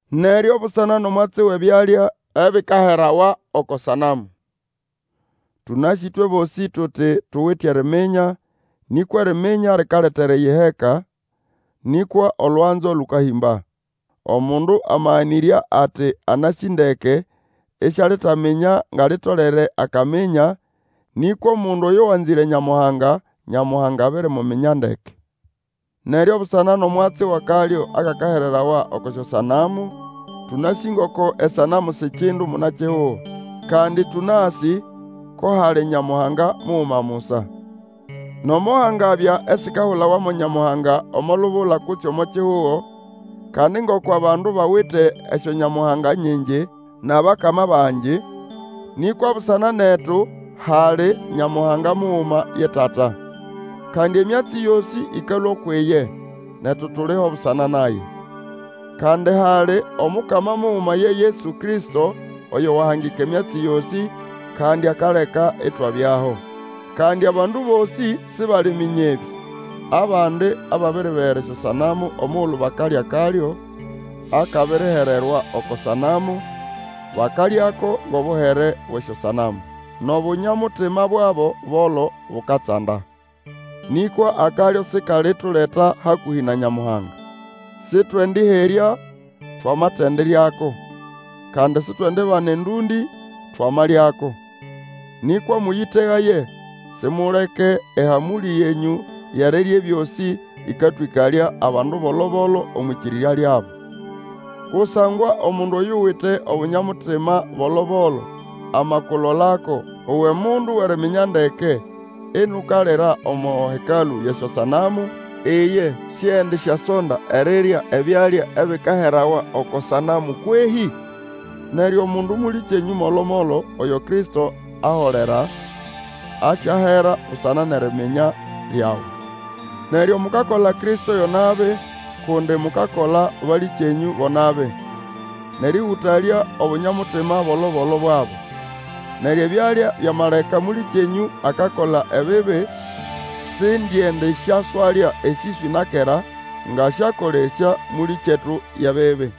Neryo busana nʼomwatsi wʼebyalya ebikaherawa oko sanamu. Tũnasĩ ĩtwe bosĩ tuti tuwite eriminya, nĩkwa eriminya likaleta eriyiheka, nĩkwa olwanzo kĩkahĩmba. Omundu amaganĩrya ati anasĩ ndeke, isialitaminya nga litolere akaminya. Nĩkwa omundu oyo wanzĩre Nyamuhanga, Nyamuhanga abirimuminya ndeke. Neryo busana nʼomwatsi wʼakalyo akakahererawa oko syosanamu, tũnasĩ ngoko esanamu si kindu muna-kihugo, kandi tũnasĩ ko hali Nyamuhanga muguma musa. Nomo hangabya esikahulawa mo nyamuhanga omo lubula kutse omo kihugo, kandi ngoko abandu bawite esyonyamuhanga nyingi, nʼabakama bangi, nĩkwa busana netu hali Nyamuhanga muguma, ye Tata. Kandi emyatsi yosĩ, ĩkalũa ukwʼiye, netu tuliho busana naye. Kandi hali Omukama muguma ye Yesu Kristo, oyo wahangika emyatsi yosĩ, kandi akaleka itwabyaho. Kandi abandu bosĩ sibaliminya ebĩ. Abandi ababiribegera esyosanamu omugulu bakalya akalyo akabirihererwa oko sanamu bakalyako ngʼobuhere bwʼesyosanamu. Nʼobunya-mutima bwabo bolo bukatsanda. Nĩkwa akalyo sikalituleta hakũhĩ na Nyamuhanga. Sĩtwendĩherya twamatendiryako, kandi sitwendibana endũndĩ twamalyako. Nĩkwa mũyĩtegaye, simuleke ehamũlĩ yenyũ yʼerirya ebyosĩ, ĩkatwĩkalya abandu bolo-bolo omwʼĩkĩrĩrya lyabo. Kusangwa omundu oyuwite Obunya-mutima bolo-bolo amakulolako uwe mundu wʼeriminya ndeke inukalira omo hekalũ yʼesyosanamu; iye siendisyasonda erirya ebyalya ebikaherawa oko sanamu kwehĩ? Neryo omundu mũlĩkyenyũ molo-molo, oyo Kristo aholera, asyahera busana nʼeriminya lyawe. Neryo mukakola Kristo yo nabi, kundi mukakola balĩkyenyũ bo nabi, nʼerĩhũtalya Obunya-mutima bolo-bolo bwabo. Neryo ebyalya byamaleka mũlĩkyetu akakola ebibi, sindiendisyaswalya esĩswĩ na kera, ngasyakolesya mũlĩkyetu yʼebibi.